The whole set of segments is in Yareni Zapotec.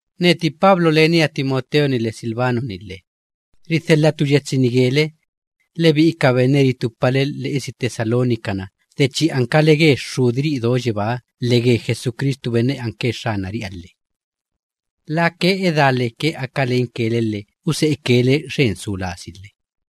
Neti Pablo, lenia Timoteo‑ni lhe Silvano‑ni lhe, ridhelhatu yetsi‑ni gele, lebi'i ka benne ritupale lhe'esi Tesalónica‑na de chi ankale ge Xxudiri'i do yebáha lhe ge Jesucristu benne anke Xxanari'iha lhe. Lake edá leke aka lenke le lhe use'eke le xen su lasi lhe.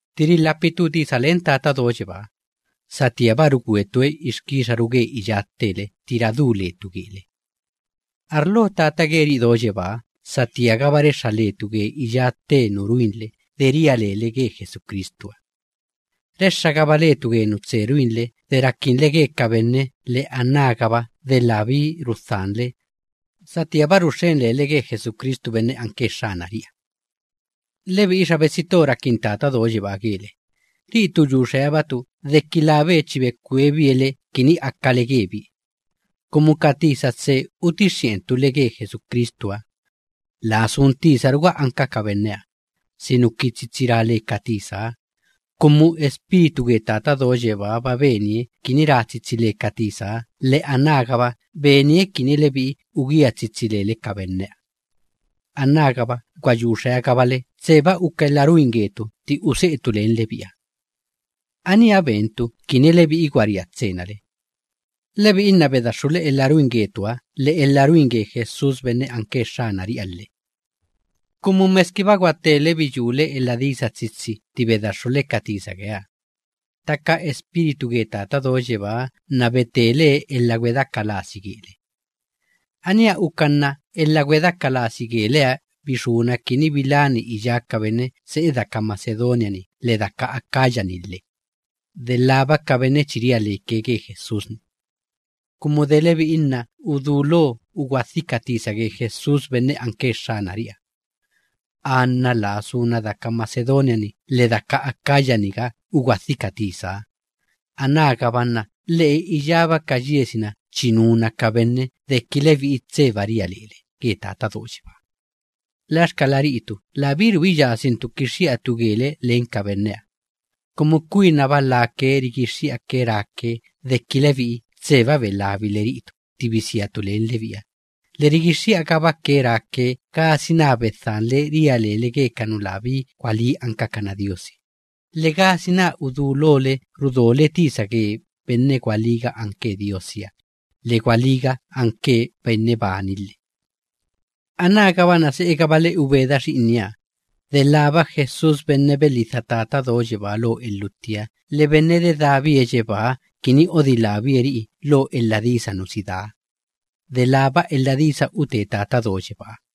Tti rilhapitu tisa len Tata Do Yebáha, satíaba rugwetue ixkixaru ge iyá ttele tti radú letu gele. Arlo Tata geri'i do yebáha satíagaba rexxa letu ge iyá tte nu ruinle de chi ria lele ge Jesucristuha. Rexxagaba letu ge nu tse ruinle de rakinle ge ka benne, lhe anágaba de labí rudhanle satíaba ruxxen lele ge Jesucristu benne anke Xxanari'iha. Lebi'i xa betsi to rakin Tata Do Yebáha gele, ri'itu yu xeabatu deki labe chi bekwebie le kini akale gebie. Kumu ka tisa tse utixxi'entu le ge Jesucristuha, laa sun tisaruga anka ka benneha, sinuki tsitsi ra le ka tisaha, kumu Espíritu ge Tata Do Yebáha‑ba benie kini ra tsitsi le ka tisaha, lhe anágaba benie kini lebi'i ugía tsitsi lele ka benneha. Anágaba lhe gwa yu xeagabale tseba uka elha ruin getu tti use'etu len lebi'iha. Aníha bentu kini lebi'i gwaria tsena le. Lebi'i nna bedaxxule elha ruin getuha lhe elha ruin ge Jesús benne anke Xxanari'iha lhe. Kumu meskiba gwatele biyúle elha disa tsitsi tti bedaxxule ka tisa geeha, ttaka Espíritu ge Tata Do Yebáha nna betelee elha gwedeaka lasi gele. Aníha uka nna elha gwedeaka lasi geleha bixúna kini bilani iyá ka benne se'e daka Macedonia‑ni lhe daka Acaya‑ni lhe, delába ka benne chi ria leke ge Jesús‑ni. Kumu de lebi'i nna udulo ugwadhi ka tisa ge Jesús benne anke Xxanari'iha. Anna laa suna daka Macedonia‑niga lhe laa suna daka Acaya‑niga ugwadhi ka tisaha, anágaba nna lhe'e iyágaba ka yiesi‑na chi nuna ka benne deki lebi'i tseba ria lele ge Tata Do Yebáha. Laxkala ri'itu labíru uka doelha kixxi'atu gele len ka benneha. Kumu kwinaba lake rigixxi'ake ráke deki lebi'i tseba belabile ri'itu tti bisiatu len lebi'iha, lhe rigixxi'agabake ráke gasina bedhanle abitturu ria lele ge ka nu labí gwalí ankakana diosi, lhe gasina udulole rudole tisa ge benne gwalíga anke Diosiha lhe gwalíga anke benne bani lhe. Anágaba nna se'egabale ubeda Xi'inieha, delába Jesús benne belhidha ben Tata Do Yebáha lo elhuttiha lhe dedábie yebáha kini odilábie ri'i lo elha disa nu si daa; delába elha disa ute Tata Do Yebáha geri'i.